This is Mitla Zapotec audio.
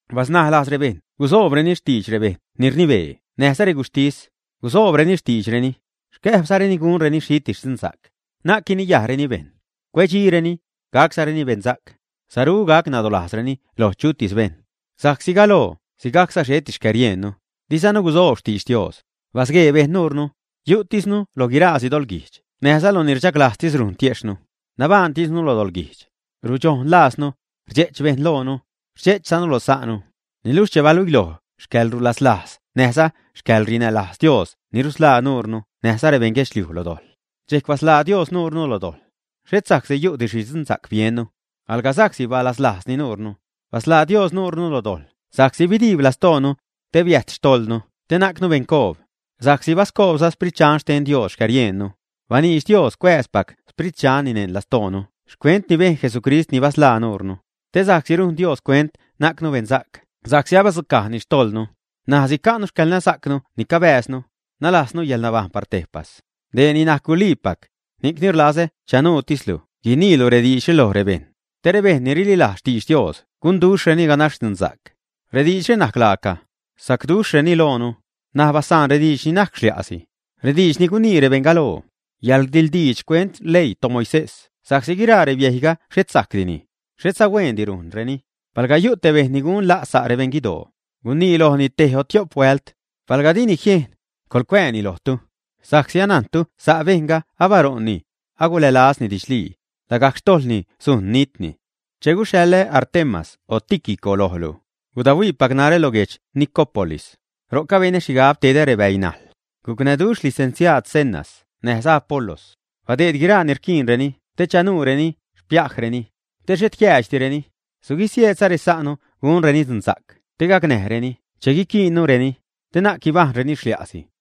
Basnaj lajz rebejṉ gusoobreni xtiidx rebejṉ ni rnibee näjza reguxhtis, gusoobreni xtiidxreni, xcäjbzareni gunreni xhitis dzunsa'c. Na'c guiniyajreni bejṉ, cuedxireni, gaczareni bensa'c, saru gac nadolajzreni loj chutis bejṉ. Sa'csi galoo sigajcza xheti xcäriejnnu, dizanu gusoob xtidx Dios; basguee bejṉ nuurnu, yu'tisnu lo guiraasi doḻguijdx näjza lo ni rchaglajztis rujn tiejxhnu, nabajṉtisnu lo doḻguijdx, rudxonlajznu, rdxe'ch bejṉ loonu, rdxe'chzanu lo sa'nu. Niluxh che baluiloj xcäḻrulaslajz näjza xcäḻrinälajz Dios ni rusḻaa nuurnu näjza rebeṉ guedxliuj lo dojḻ, dxejc basḻaa Dios nuurnu lo dojḻ, xhet sa'csi yu'di xhi dzunsa'c biennu, alga sa'csi balaslajzni nuurnu. Basḻaa Dios nuurnu lo dojḻ sa'csi bidiib lastoonu, te biäjt xtojḻnu te najcnu beṉcoob, sa'csi bascoobza Xsprit Dxan xten Dios xcäriejnnu. Baniidx Dios cuääzpac Xsprit Dxanni neṉ lastoonu xcuent ni bejn Jesucrist ni basḻaa nuurnu, te sa'csi rujn Dios cuent najcnu beṉsa'c sa'csi abadzucajni xtojḻnu, ṉaj sica'nu xcäḻnasa'cnu ni cabääznu, nalaaznu yäḻnabajṉ par tejpas. Dee ni najc guliipac, ni'cni rlazä chanuutislu guiniilu rediidxre loj rebejṉ, te rebejṉ ni rililajz xtidx Dios gunduxhreni ganax dzunsa'c. Rediidxre najc laaca, sacduxhreni loonu. N̲aj basaan rediidx ni najc xlia'si, rediidx ni gunii rebeṉ galoo, yäḻrdiḻdiidx xcuent xleii toMoisés sa'csi guiraa rebiejyga xhet sajcdini, xhetza huendi rujnreni. Palga yu' te bejṉ ni gun la' sa' rebeṉ guidoo, gunii lojni tej o tio'p huält. Palga dini jiejn, coḻcuääni lojtu. Sa'csi anajntu sa' bejṉga abaṟo'nni, agulälazni didxlii, lagajc xtojḻni sujn nitni. Che guxhaḻä Artemas o Tíquico lojlu, gudahuiipac narä lo guedx Nicópolis. Ro'c abenä xhigab tedä rebäinajḻ. Gucnäduxh licenciaad Zenas näjza Apolos, badeed guiraa ni rquiinreni te chanuureni xpiajreni, te xhet jiäädxdireni. Suguisieedza resa'nu gunreni dzunsa'c te gacnäjreni che guiquiinnureni, te na'c guibajṉreni xlia'si.